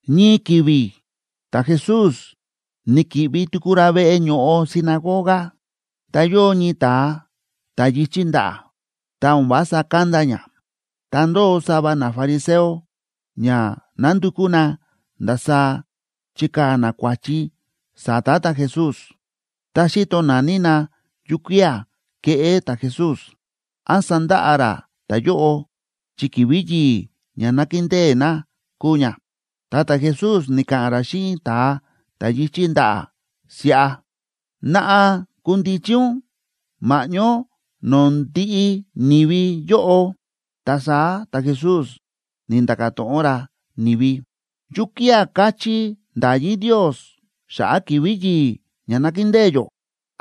Ñii ki̱vi̱ ta̱Jesús ni̱ki̱ꞌvi tuku ra veꞌe ño̱ꞌo sinagoga, ta yóo ñii ta̱a ta̱ yi̱chí ndaꞌa̱, ta o̱n vása kánda ña. Ta ndóo sava nafariseo ña nándukú na ndasaá chikaa̱ na kua̱chi sa̱ta̱ ta̱Jesús. Ta xíto naní na yukía̱ keꞌé ta̱Jesús, án sandaꞌa ra ta̱yóꞌo, chi ki̱vi̱ yi̱i̱ ña nákindée na kúu ña. Ta ta̱Jesús ni̱ka̱ꞌa̱n ra xíꞌin ta̱a ta̱ yi̱chí ndaꞌa̱ siꞌa: ―Naꞌa kundichi ún ma̱ꞌñó no̱o̱ ndiꞌi ni̱vi yóꞌo. Ta saá ta̱Jesús ni̱nda̱ka̱ to̱ꞌon ra ni̱vi: ―¿Yukía̱ káchí nda̱yí Ndios xa̱ꞌa̱ ki̱vi̱ yi̱i̱ ña nákindée yó?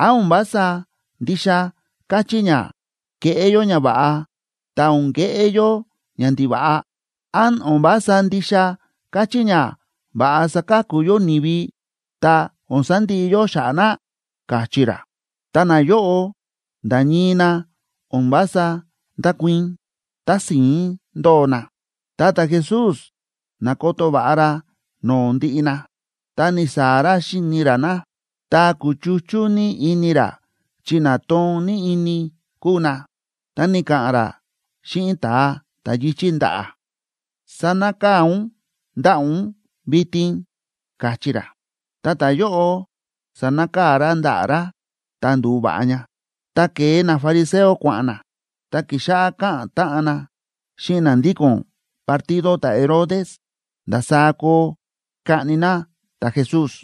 ¿Án o̱n vása ndixa káchí ña keꞌé yó ñava̱ꞌa ta o̱n keꞌé yó ñandiva̱ꞌa? ¿Án o̱n vása ndixa káchí ña va̱ꞌa saka̱ku yó ni̱vi ta o̱n sandiꞌi yó xa̱ꞌa̱ na? ―káchí ra. Ta nayóꞌo nda̱ ñii na o̱n vása ndákuii̱n, tási̱ín ndóo na. Ta ta̱Jesús na̱koto va̱ꞌa ra no̱o̱ ndiꞌi na, ta ni̱saa̱ ra xíni ra na, ta kúchuchú ní ini ra chi na toon ní ini kúu na. Ta ni̱ka̱ꞌa̱n ra xíꞌin ta̱a ta̱ yi̱chí ndaꞌa̱: ―Sanakaa̱ ún ndaꞌa̱ ún vitin ―káchí ra. Ta ta̱yóꞌo sa̱nakaa̱ ra ndaꞌa̱ ra, ta ndu̱va̱ꞌa ña. Ta ke̱e nafariseo kua̱ꞌa̱n na, ta ki̱xáꞌá káꞌa̱n táꞌan na xíꞌin na ndíko̱n partido ta̱Herodes ndasaá koo kaꞌni na ta̱Jesús.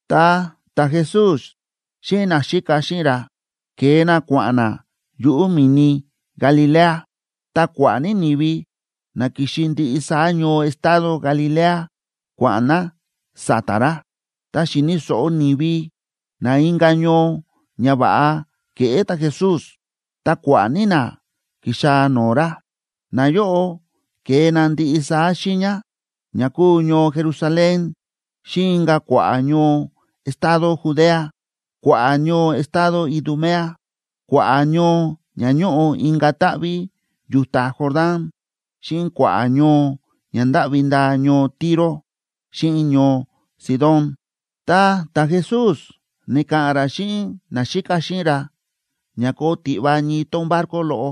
Ta ta̱Jesús xíꞌin naxíka xíꞌin ra ke̱e na kua̱ꞌa̱n na yuꞌu̱ mi̱ni Galilea. Ta kua̱ꞌa̱ ní ni̱vi na ki̱xi ndiꞌi saá ñoo estado Galilea kua̱ꞌa̱n na sa̱ta̱ ra. Tá xi̱ni̱ so̱ꞌo ni̱vi na inka̱ ñoo ñava̱ꞌa kéꞌé ta̱Jesús, ta kua̱ꞌa̱ ní na ki̱xaa̱ no̱o̱ ra. Nayóꞌo ke̱e na ndiꞌi saá xiiña, ña kúu ñoo Jerusalén xíꞌin inka̱ kua̱ꞌa̱ ñoo estado Judea, kua̱ꞌa̱ ñoo estado Idumea, kua̱ꞌa̱ ñoo ña ñóꞌo inka̱ táꞌví yu̱ta Jordán, xíꞌin kua̱ꞌa̱ ñoo ña ndáꞌvi ndaa ñoo Tiro, xíꞌin ñoo Sidón. Ta ta̱Jesús ni̱ka̱ꞌa̱n ra xíꞌin naxíka xíꞌin ra ña koo tiꞌva ñii tón barco loꞌo,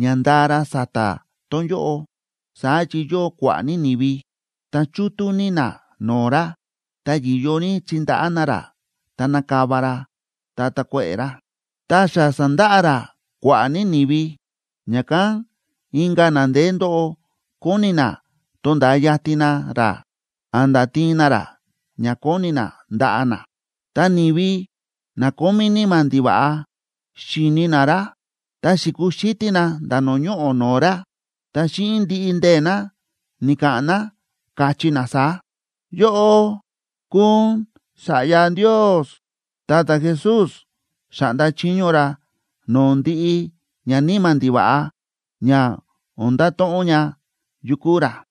ña ndaa ra sa̱ta̱ tón yóꞌo, saá chi yóo kua̱ꞌa̱ ní ni̱vi, ta chútú ní na no̱o̱ ra, ta yi̱yo ní chindaꞌá na ra ta nakava ra ta takuéꞌe̱ ra. Ta xa sa̱ndaꞌa ra kua̱ꞌa̱ ní ni̱vi, ña̱kán inka̱ na ndeé ndóꞌo kóni na tonda̱a yatin na ra a̱nda̱ tiin na ra ña koni na ndaꞌa na. Ta ni̱vi na kómí níma̱ ndiva̱ꞌa xi̱ni na ra, ta xi̱kuxítí na nda̱ no̱o̱ ñoꞌo̱ no̱o̱ ra, ta xíꞌin ndiꞌi ndee̱ na ni̱ka̱ꞌa̱n na, káchí na saá: ―¡Yóꞌó kúu ún Sa̱ꞌya Ndios! Ta ta̱Jesús xa̱ꞌnda chiño ra no̱o̱ ndiꞌi ñaníma̱ ndiva̱ꞌa ña o̱n ndato̱ꞌon ña yu kúu ra.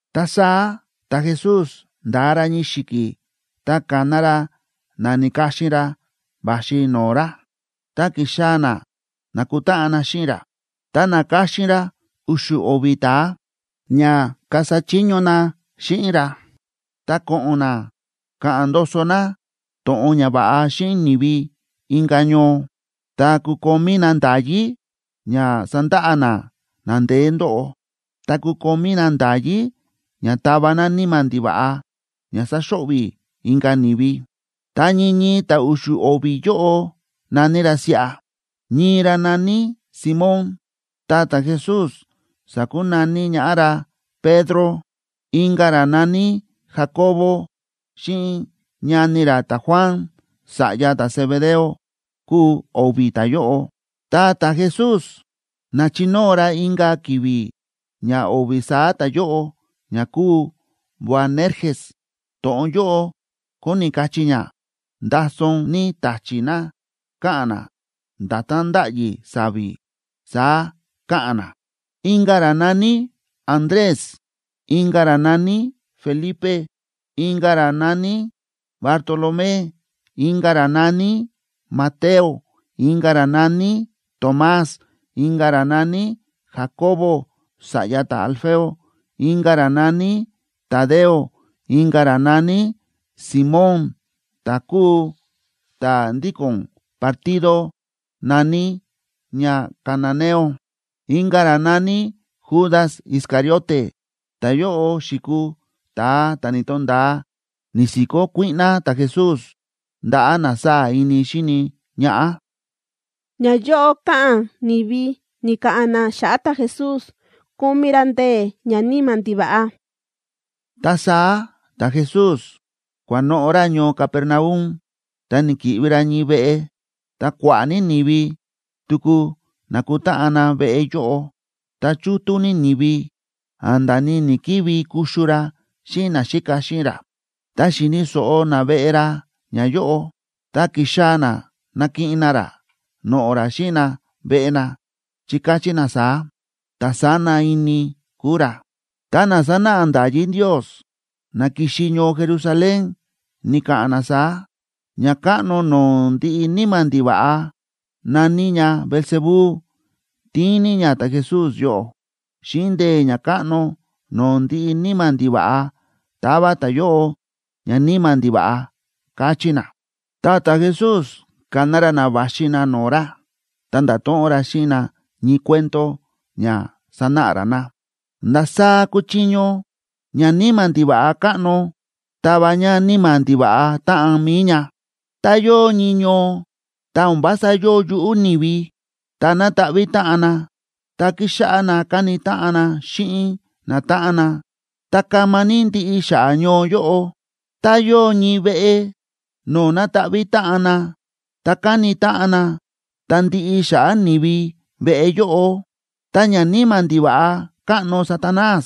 Ta saá ta̱Jesús nda̱a ra ñii xi̱ki̱ ta ka̱na ra na na̱ka̱xin ra va̱xi no̱o̱ ra, ta ki̱xaa̱ na nakutáꞌan na xíꞌin ra. Ta na̱ka̱xin ra u̱xu̱ o̱vi̱ ta̱a, ña kasa chiño na xíꞌin ra, ta ko̱ꞌo̱n na ka̱ꞌa̱n ndoso na to̱ꞌon ñava̱ꞌa xíꞌin ni̱vi inka̱ ñoo, ta kukomí na nda̱yí ña sandaꞌa na na ndeé ndóꞌo, ta kukomí na nda̱yí ña tava na níma̱ ndiva̱ꞌa ña saxo̱ꞌvi̱ inka̱ ni̱vi. Ta ñii ñii ta̱ u̱xu̱ o̱vi̱ yóꞌo na̱ní ra siꞌa: ñii ra na̱ní Simón, ta ta̱Jesús sa̱kunaní ñaꞌá ra Pedro; inka̱ ra na̱ní Jacobo, xíꞌin ñani ra ta̱Juan, sa̱ꞌya ta̱Zebedeo kúu o̱vi̱ ta̱yóꞌo, ta ta̱Jesús na̱chinóo ra inka̱ ki̱vi̱ ña o̱vi̱ saá ta̱yóꞌo ña kúu Boanerges; to̱ꞌon yóꞌo kóni kachí ña: Ndason ní ta̱chi̱ na káꞌa̱n na, nda̱tán ndáꞌyi sa̱vi̱, saá káꞌa̱n na; inka̱ ra na̱ní Andrés; inka̱ ra na̱ní Felipe; inka̱ ra na̱ní Bartolomé; inka̱ ra na̱ní Mateo;a inka̱ ra na̱ní Tomás; inka̱ ra na̱ní Jacobo, sa̱ꞌya ta̱Alfeo; inka̱ ra na̱ní Tadeo; inka̱ ra na̱ní Simón ta̱ kúu ta̱ ndíko̱n partido na̱ní ña cananeo; inka̱ ra na̱ní Judas Iscariote. Ta̱yóꞌo xi̱kuu ta̱a ta̱ ni̱to̱nda̱a ni̱si̱kó kuíꞌná ta̱Jesús ndaꞌa̱ na sáa̱ ini xíni ñaꞌá. Ñayóꞌo káꞌa̱n ni̱vi ni̱ka̱ꞌa̱n na xa̱ꞌa̱ ta̱Jesús kómí ra ndee̱ ñaníma̱ ndiva̱ꞌa Ta saá ta̱Jesús kua̱noꞌo̱ ra ñoo Capernaum, ta ni̱ki̱ꞌvi ra ñii veꞌe, ta kua̱ꞌa̱ ní ni̱vi tuku na̱kutáꞌan na veꞌe yóꞌo, ta chútú ní ni̱vi a̱nda̱ ni ni̱‑kivi kuxu ra xíꞌin naxíka xíꞌin ra. Tá xi̱ni̱ so̱ꞌo naveꞌe ra ñayóꞌo, ta ki̱xaa̱ na nakiꞌin na ra noꞌo̱ ra xíꞌin na veꞌe na, chi káchí na saá: ―Ta̱ sána ini kúu ra. Ta na sánáꞌa nda̱yí Ndios na ki̱xi ñoo Jerusalén, ni̱ka̱ꞌa̱n na saá: ―Ñakáꞌno no̱o̱ ndiꞌi níma̱ ndiva̱ꞌa, na̱ní ña Beelzebú,b tíin ní ña ta̱Jesús yóꞌo. Xíꞌin ndee̱ ñakáꞌno no̱o̱ ndiꞌi níma̱ ndiva̱ꞌa táva ta̱yóꞌo ñaníma̱ ndiva̱ꞌa ―káchí na. Ta ta̱Jesús ka̱na ra na va̱xi na no̱o̱ ra, ta nda̱to̱ꞌon ra xíꞌin na ñii cuento ña sanáꞌa ra na: ―¿Ndasaá kúchiño ñaníma̱ ndiva̱ꞌa káꞌno tava ña níma̱ ndiva̱ꞌa táꞌan mi̱i ña? Tá yóo ñii ñoo, ta o̱n vása yóo yuꞌú ni̱vi, ta na̱taꞌví táꞌan na, ta ki̱xáꞌá na káni táꞌan na xíꞌin natáꞌan na, ta kama ní ndiꞌi xa̱ꞌa̱ ñoo yóꞌo. Tá yóo ñii veꞌe no̱o̱ na̱taꞌví táꞌan na, ta káni táꞌan na, ta ndiꞌi xa̱ꞌa̱ ni̱vi veꞌe yóꞌo. Ta ñaníma̱ ndiva̱ꞌa káꞌno Satanás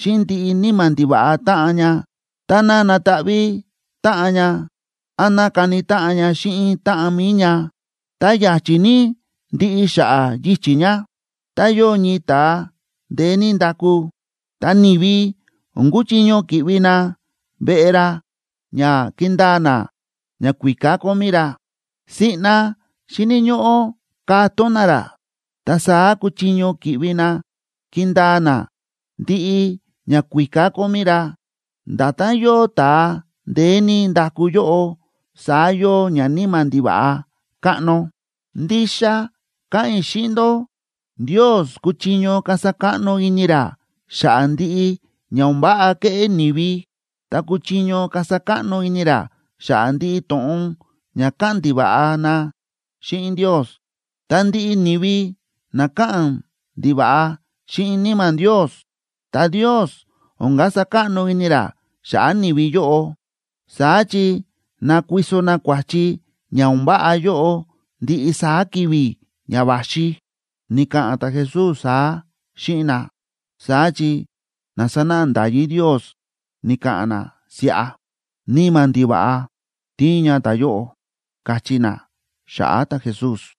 xíꞌin ndiꞌi níma̱ ndiva̱ꞌa táꞌan ña, táná nataꞌví táꞌan ña án ná kani táꞌan ña xíꞌin táꞌan mi̱i ña, ta ya̱chi̱ ní ndiꞌi xa̱ꞌa̱ yichi̱ ña. ’Tá yóo ñii ta̱a ndeé ní ndaku, ta ni̱vi o̱n kuchiño ki̱ꞌvi na veꞌe ra ña kindaa na ñakuíká kómí ra. Siꞌna xíni̱ ñóꞌó katón na ra, ta saá kuchiño ki̱ꞌvi na kindaa na ndiꞌi ñakuíká kómí ra. Nda̱tán yóo ta̱a ndeé ní ndaku yóꞌo, saá yóo ñaníma̱ ndiva̱ꞌa káꞌno. ’Ndixa káꞌa̱n i̱ xíꞌin ndó, Ndios kúchiño kasa káꞌno ini ra xa̱ꞌa̱ ndiꞌi ña o̱n váꞌa kéꞌé ni̱vi, ta kúchiño kasa káꞌno ini ra xa̱ꞌa̱ ndiꞌi to̱ꞌon ña káꞌa̱n ndiva̱ꞌa na xíꞌin Ndios. Ta ndiꞌi ni̱vi na káꞌa̱n ndiva̱ꞌa xíꞌin Níma̱ Ndios,c ta Ndios o̱n kasa káꞌno ini ra xa̱ꞌa̱ ni̱vi yóꞌo, saá chi nakuiso na kua̱chi ña o̱n váꞌa yóꞌo ndiꞌi saá ki̱vi̱ ña va̱xi. Ni̱ka̱ꞌa̱n ta̱Jesús saá xíꞌin na, saá chi na sánáꞌa nda̱yí Ndios ni̱ka̱ꞌa̱n na siꞌa: ―Níma̱ ndiva̱ꞌa tíin ña ta̱yóꞌo ―káchí na xa̱ꞌa̱ ta̱Jesús.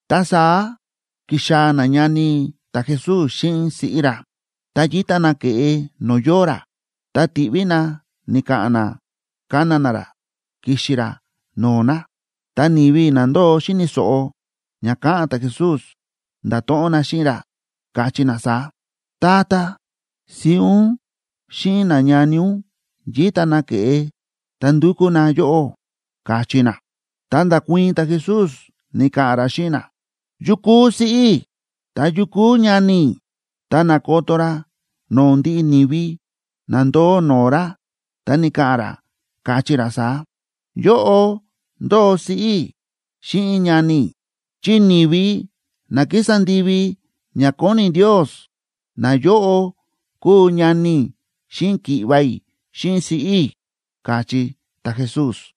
Ta saá ki̱xaa̱ nañani ta̱Jesús xíꞌin siꞌí ra. Ta yíta na ke̱ꞌe no̱o̱ yóo ra, ta ti̱ꞌví na ni̱ka̱ꞌa̱n na kana na ra kixi ra no̱o̱ na. Ta ni̱vi na ndóo xíni̱ so̱ꞌo ña káꞌa̱n ta̱Jesús, nda̱to̱ꞌon na xíꞌin ra, káchí na saá: ―Tata, siꞌí ún xíꞌin nañani ún yíta na ke̱ꞌe, ta ndúkú na yóꞌó ―káchí na. Ta nda̱kuii̱n ta̱Jesús, ni̱ka̱ꞌa̱n ra xíꞌin na: ―¿Yu kúu siꞌí i̱? ¿Ta yu kúu ñani i̱? Ta na̱koto ra no̱o̱ ndiꞌi ni̱vi na ndóo no̱o̱ ra, ta ni̱ka̱ꞌa̱n ra, káchí ra saá: ―Yóꞌo ndóo siꞌí i̱ xíꞌin ñani i̱. Chi ni̱vi na kísa ndivi ña kóni Ndios, nayóꞌo kúu ñani i̱ xíꞌin ki̱ꞌva̱ i̱ xíꞌin siꞌí i̱ ―káchí ta̱Jesús.